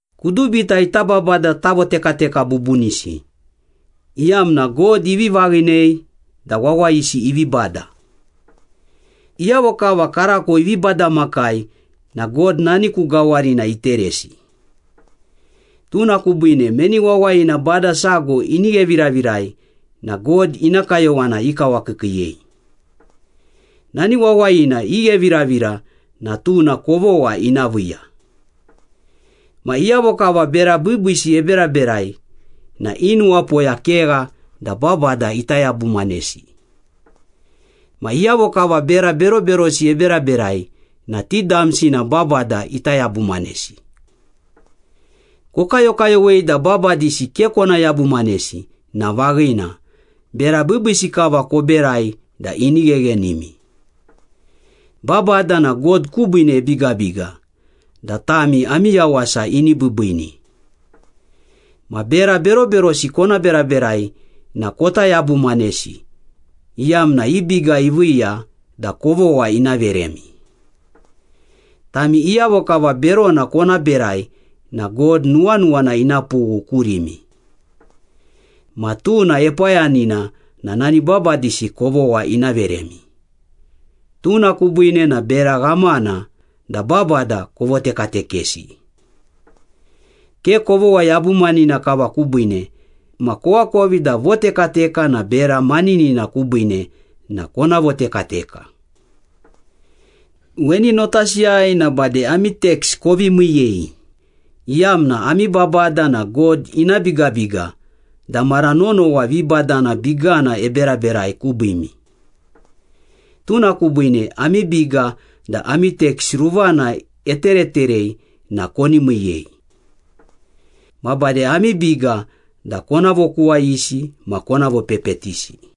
Kudubita ita babada tavotekateka bubunisi, iyamna God ivi vaghinei da wawayisi ivi bada. Iyavo kava karako ivi badamakai na God nani ku gawarina iteresi. Tuna kubiine, meni wawayina bada sago ini gheviravirai na God ina kayowana ikawakiikiiyei. Nani wawayina igheviravira na tuna kovogha ina viiya. Ma iyavo kava bera biibiisi eberaberai na i nuwapoya kegha da babada ita yabumanesi. Ma iyavo kava bera beroberosi eberaberai na ti damsi na babada ita yabumanesi. Kokayokayowei da babadisi ke kona yabumanesi na vaghina, bera biibiisi kava koberai da ini gheghenimi. Babada na God kubiine ebigabiga da tami ami yawasa ini biibiini. Ma bera beroberosi kona beraberai na kota yabumanesi, iyamna i biga iviiya da kovogha ina veremi. Tami iyavo kava berona kona berai na God nuwanuwana ina pughu kurimi. Ma tuna epayanina na nani babadisi kovogha ina veremi. Tuna kubiine na bera ghamana da babada kovotekatekesi. Ke kovogha yabumanina kava kubiine ma koakovi da votekateka na bera maninina kubiine na kona votekateka. Weni notasiyai na bade ami teks kovi miiyei, iyamna ami babada na God ina bigabiga da mara nonowa vibadana bigana eberaberai kubiimi. Tuna kubiine ami biga da ami teks ruvana etereterei na koni miiyei. Ma bade ami biga da kona vokuwayisi ma kona vopepetisi.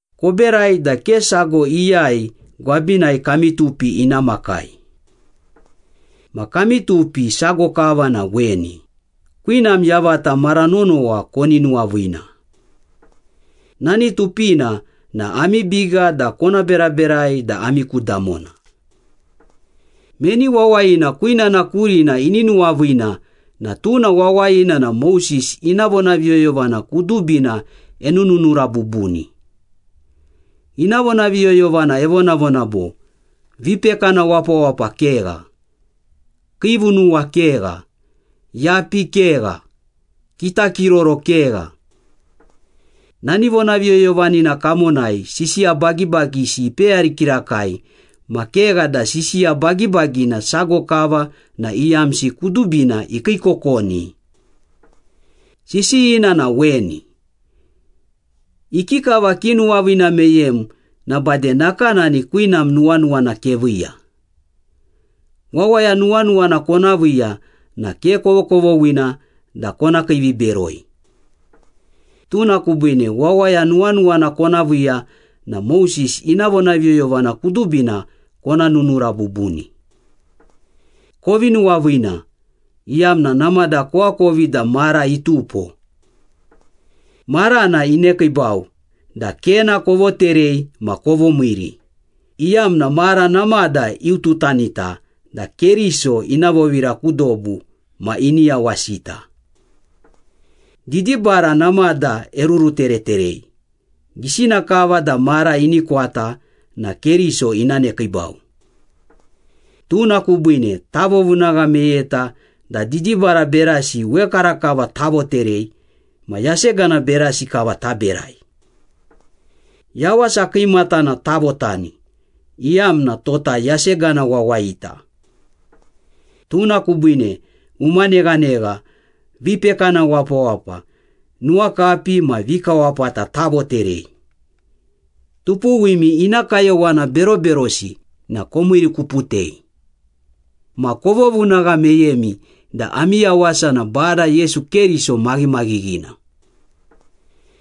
Koberai da ke sago iyai gwabinai kami tupi ina makai. Ma kami tupi sago kava na weni, kwinam yavata mara nonowa koni nuwaviina. Nani tupina na ami biga da kona beraberai da ami ku damona. Meni wawayina kwinana kurina ini nuwaviina na tuna wawayina na Moses ina vonaviyoyovana kudubina enununura bubuni. Ina vonaviyoyovana evonavona bo, “Vipekana wapawapa kegha, kiivunuwa kegha, yapi kegha, kitakiroro kegha.” Nani vonaviyoyovanina kamonai sisiya bagibagisi ipeyari kirakai ma kegha da sisiya bagibagina sago kava na iyamsi kudubina ikiikokoni. Sisiyina na weni. “Ikikava kinuwaviina meyem na bade nakanani kwinam nuwanuwana keviiya.” Wawaya nuwanuwana kona viiya na ke kovokovoghina da kona kiiviberoi. Tuna kubiine wawaya nuwanuwana kona viiya na Moses ina vonaviyoyovana kudubina kona nunura bubuni. Kovi nuwaviina, iyamna namada koakovi da mara itupo. Marana inekiibau da kena kovoterei ma kovomiiri, iyamna mara namada iututanita da Keriso ina vovira ku dobu ma ini yawasita. Didibara namada erurutereterei, gisina kava da mara ini kwata na Keriso ina nekiibau. Tuna kubiine tavovunagha meyeta da didibara berasi wekarakava tavoterei ma yasegana berasi kava taberai. Yawasa kiimatana tavotani, iyamna tota yasegana wawayita. Tuna kubiine uma neghanegha, vipekana wapawapa, nuwakapi ma vikawapata tavoterei. Tupuwimi ina kayowana beroberosi na komiirikuputei. Ma kovovunagha meyemi da ami yawasa na Bada Yesu Keriso maghimaghighina.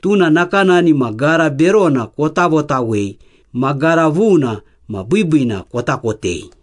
Tuna nakanani ma gara berona kota votawei ma gara vuna ma biibiina kota kotei.